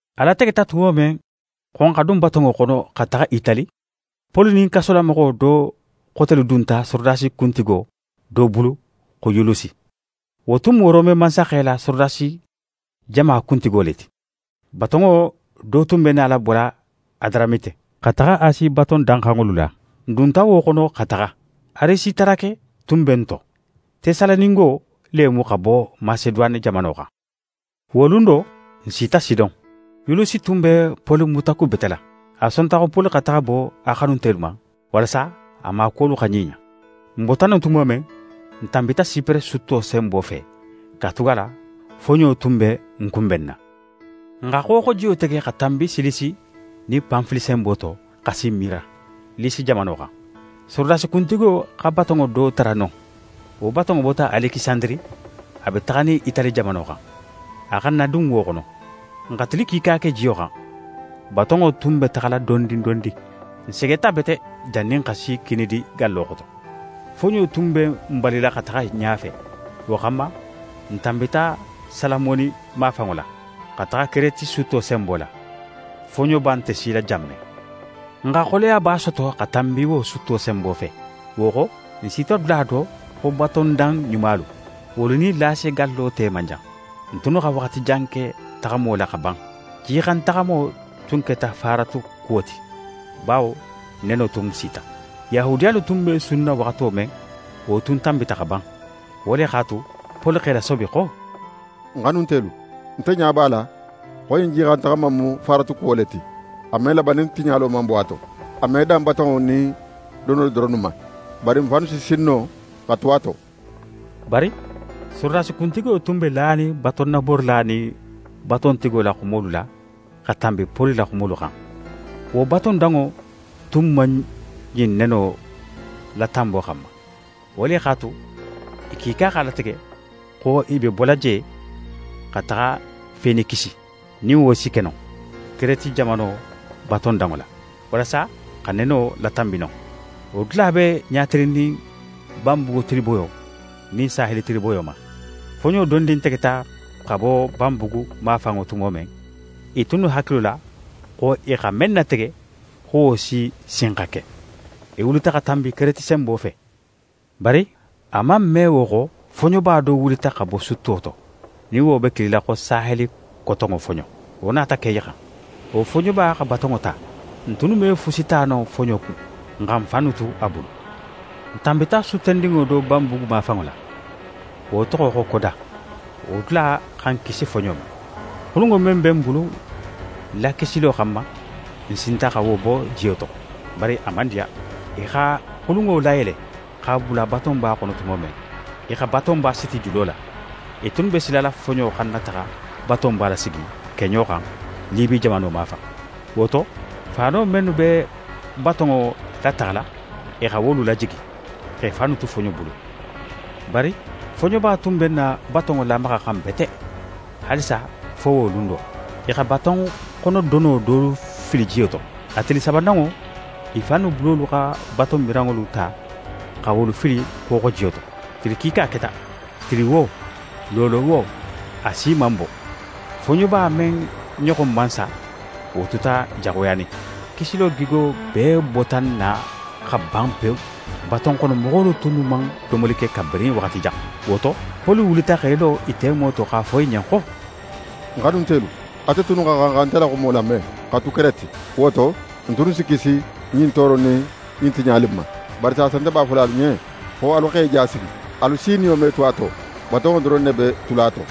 A lategeta tumo men xo n xa dun batonŋo xono xa taxa Itali, Poli nin kasolamoxo do xotelu dunta sorodasi kuntigo do bulu xo Yulusi. Wo tun mu Rome mansaxe la sorodasi jama kuntigo le ti. Batonŋo do tun be nala bola Adaramite, xa taxa Asi baton danxanŋolu la. N dunta wo xono xa taxa. Arisitarake tun be n to, Tesalonikengo le mu xa bo Maseduwane jamano xan. Wo lun do, n sita Sidon. Yulusi tun be Poli mutakubetela. A sonta xo Poli xa taxa bo a xanuntelu ma, walasa a maakuwolu xa ɲiɲa. N bota non tumo men, n tanbita Sipere sutto senbo fe, katugala foɲo tun be n kunbenna. N xa xooxojiyo tege xa tanbi Silisi nin Panfili senbo to, xa si Mira, Lisi jamano xan. Sorodasi kuntigo xa batonŋo do tara non. Wo batonŋo bota Alekisandiri, a be taxanin Itali jamano xan. A xa n nadun wo xono. N xa tili kiika ke jiyo xan, batonŋo tun be taxala dondin dondin. N segeta bete jannin n xa si Kinidi gallo xoto. Foɲo tun be n balila xa taxa ɲafe; wo xanma, n tanbita Salamoni mafanŋo la, xa taxa Kereti sutto senbo la, foɲoba nte sila jan men. N xa xoleyaba soto xa tanbi wo sutto senbo fe. Wo xo, n sita dula do xo “Batondan Ɲumalu”. Wolu nin Lase gallo te man jan. N tunnu xa waxati jan ke taxamo la xa ban. Jixantaxamo tun keta faaratu kuwo ti, bawo neno tun sita. Yahudiyalu tunnu be sunna waxato men, wo tun tanbita xa ban. Wo le x'a tu, Poli x'e lasobi xo: «Ń xanuntelu, nte ɲa b'a la xo ɲin jixantaxama in mu faaratu kuwo le ti: A me laban nin tiɲalo man bo a to. A me dan batonŋo nin donolu doronnu ma, bari n fannu si sin no xa tu a to.» Bari sorodasi kuntigo tun be lanin batonnaborila nin batontigo la xumolu la xa tanbi Poli la xumolu xan. Wo batondanŋo tun man ɲin neno latanbo xanma. Wo le x'a tu, i kiika x'a latege xo i be bola je xa taxa Fenikisi, nin wo si ke no, Kereti jamano batondanŋo la, walasa xa neno latanbi non. Wo dula be ɲatilinnin banbugu tiliboyo nin saheli tiliboyo ma. Foɲo dondin tegeta xa bo banbugu mafanŋo tumo men, i tunnu hakilo la xo i xa men natege xo wo si sin xa ke. I wulita xa tanbi Kereti senbo fe. Bari a man me wo xo, foɲoba do wulita xa bo sutto to, nin wo be kilila xo “saheli kotonŋo foɲo”, wo nata ke i xan. Wo foɲoba xa batonŋo ta. N tunnu me fusi ta no foɲo kun. N xa n fannu tu a bulu. N tanbita suttendinŋo do banbugu mafanŋo la, wo toxo xo Koda. Wo dula xa n kisi foɲo ma. Xulunŋo men be n bulu lakisilo xanma, n sinta xa wo bo jiyo to, bari a man diya. I xa xulunŋo layele, x'a bula batonba xono tumo men, i xa batonba siti julo la. I tunnu be silala foɲo xana taxa batonba lasigi keɲo xan Libi jamano mafan. Wo to, faano mennu be batonŋo lataxala, i xa wolu lajigi, x'e fannu tu foɲo bulu. Bari foɲoba tun be n na batonŋo lamaxaxan bete haalisa fo wo lun do, i xa batonxonodono dolu fili jiyo to. A tili sabananŋo, i fannu bulolu xa batonmiranŋolu ta xa wolu fili xooxojiyo to. Tili kiika keta, tili wo, loolo wo, a si man bo. Foɲoba men ɲoxon man sa, wo tuta jaxuyanin. Kisilo gigo bee bota n na xa ban pewu. Batonxonomoxolu tunnu man domoli ke kabirin waxati jan. Wo to, Poli wulita x'é lo i temo to x'a fo i ɲen xo: «Ń xanuntelu, ate tunnu xa xan xa nte la xumo lame xa tu Kereti. Wo to, n tunnu si kisi ɲin tooro in nin ɲin tiɲali in ma. Bari saasa, nte b'a fola alu ɲen xo alu x'e ja sigi. Alu si niyo me tu a to, batonŋo doron ne be tula a to.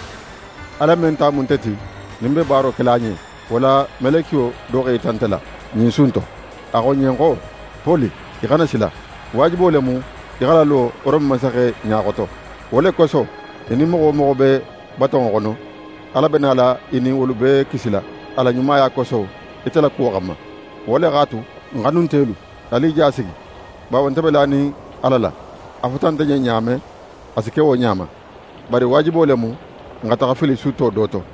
Ala men ta mu nte ti, nin ń be baaro kela a ɲen, wo la melekiyo do x'é yita nte la, ɲin su in to. A xo ń ɲen xo: “Poli, í xana sila. Waajibo le mu í xa lalo Rome mansaxe ɲa xoto. Wo le koso, í nin moxo wo moxo be batonŋo xono, Ala be nala í nin wolu bee kisila a la ɲumaya koso ite la kuwo xanma.” Wo le x'a tu, ń xanuntelu, alu i ja sigi, bawo nte be lanin Ala la. A fota nte ɲen ɲa men, a si ke wo ɲa ma. Bari waajibo le mu, n xa taxa fili sutto do to.»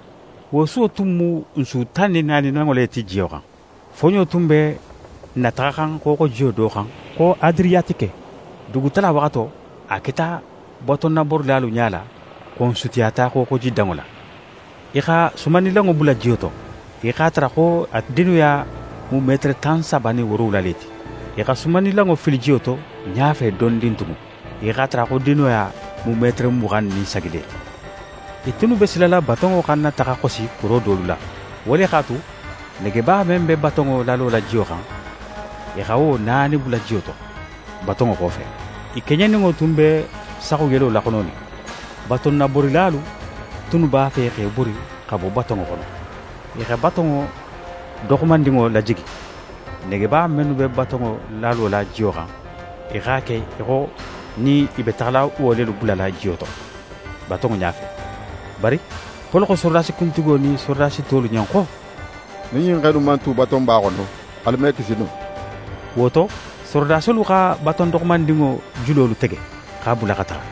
Wo suwo tun mu n su tan nin naaninanŋo le ti jiyo xan. Foɲo tun be n nataxaxan xooxojiyo do xan xo Adiriyatike. Dugutala waxato, a keta batonnaborilalu ɲala xo n sutiyata xooxojidanŋo la. I xa sumannilanŋo bula jiyo to. I x'a tara xo a dinoya mu metere tan saba nin woorowula le ti. I xa sumannilanŋo fili jiyo to ɲafe dondin tugun, i x'a tara xo dinoya mu metere muxan nin sagi le ti. I tunnu be silala batonŋo xana taxa xosi kuro dolu la. Wo le x'a tu, negeba men be batonŋo lalola jiyo xan, i xa wo naani bula jiyo to, batonŋo xofe. I keɲeninŋo tun be saxuyelo laxononin. Batonnaborilalu tunnu b'a fe x'e bori xa bo batonŋo xono. I xa baton doxomandinŋo lajigi. Negeba mennu be batonŋo lalola jiyo xan, i x'a ke í xo nin i be taxala wo lelu bulala jiyo to, batonŋo ɲafe. Bari Poli xo sorodasi kuntigo nin sorodasi tolu ɲen xo: «Nin ɲin xe innu man tu batonba xono, alu me kisi no.» Wo to, sorodasolu xa baton doxomandinŋo julolu tege, x'a bula xa taxa.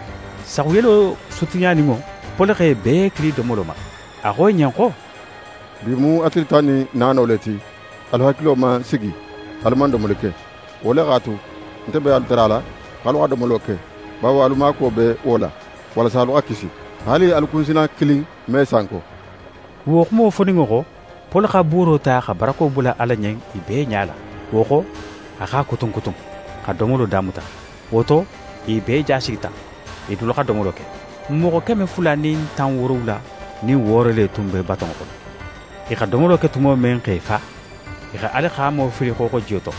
Saxuyelo sutiyaninŋo, Poli x'e bee kili domolo ma. A xo i ɲen xo: «Bi mu a tili tan nin naano le ti, alu hakilo man sigi, alu man domoli ke. Wo le x'a tu, nte be alu tarala x'alu xa domolo ke, bawo alu maakuwo be wo la, walasa alu xa kisi. Haali alu si kunsina kilin me sanko.» Wo xumo foninŋo xo, Poli xa buuro ta xa barako bula Ala ɲen i bee ɲala, wo xo, a x'a kutun kutun, xa domolo damuta. Wo to, i bee ja sigita, i dulu xa domolo ke. N moxo keme fula nin tan woorowula nin wooro le tun be batonŋo xono. I xa domolo ke tumo men x'e fa, i xa alixaamo fili xooxojiyo to,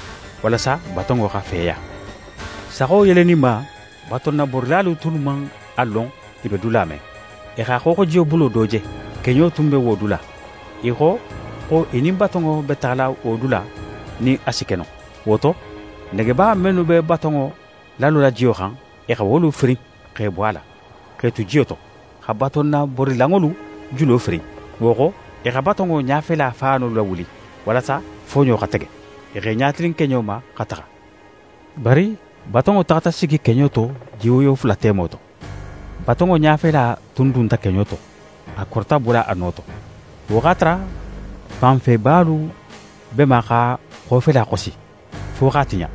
walasa batonŋo xa feya. Saxo yeleninma, batonnaborilalu tunnu man a lon i be dula men. I xa xooxojiyo bulo do je, keɲo tun be wo dula. I xo xo i nin batonŋo be taxala wo dula nin a si ke no. Wo to, negeba mennu be batonŋo lalola jiyo xan, i xa wolu firin x'e bo a la, x'e tu jiyo to, xa batonnaborilanŋolu julo firin. Wo xo, i xa batonŋo ɲafela faano lawuli, walasa foɲo xa tege. I x'e ɲatilin keɲo ma xa taxa. Bari batonŋo taxata sigi keɲo to, jiwoyo fula temo to. Batonŋo ɲafela tun dunta keɲo to, a korita bola a no to. Wo x'a tara fanfebalu be ma x'a xofela xosi, fo x'a tiɲa.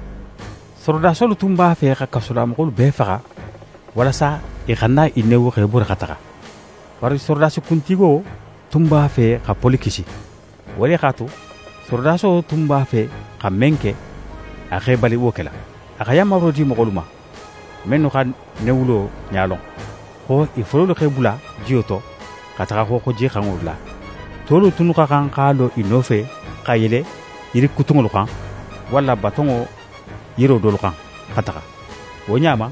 Sorodasolu tunnu b'a fe xa kasolamoxolu bee faxa, walasa i xana i newu x'e bori xa taxa. Bari sorodasi kuntigo tun b'a fe xa Poli kisi. Wo le x'a tu, sorodaso tunnu b'a fe xa men ke, a x'e bali wo kela. A xa yanmaro di moxolu ma, mennu xa newulo ɲa lon, xo i fololu x'e bula jiyo to xa taxa xooxojixanŋo la. Tolu tunnu xa xan x'a lo i nofe xa yele yirikutunŋolu xan, walla batonŋo yiro dolu xan, xa taxa. Wo ɲa ma,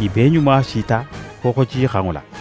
i bee ɲuma sita xooxojixanŋo la.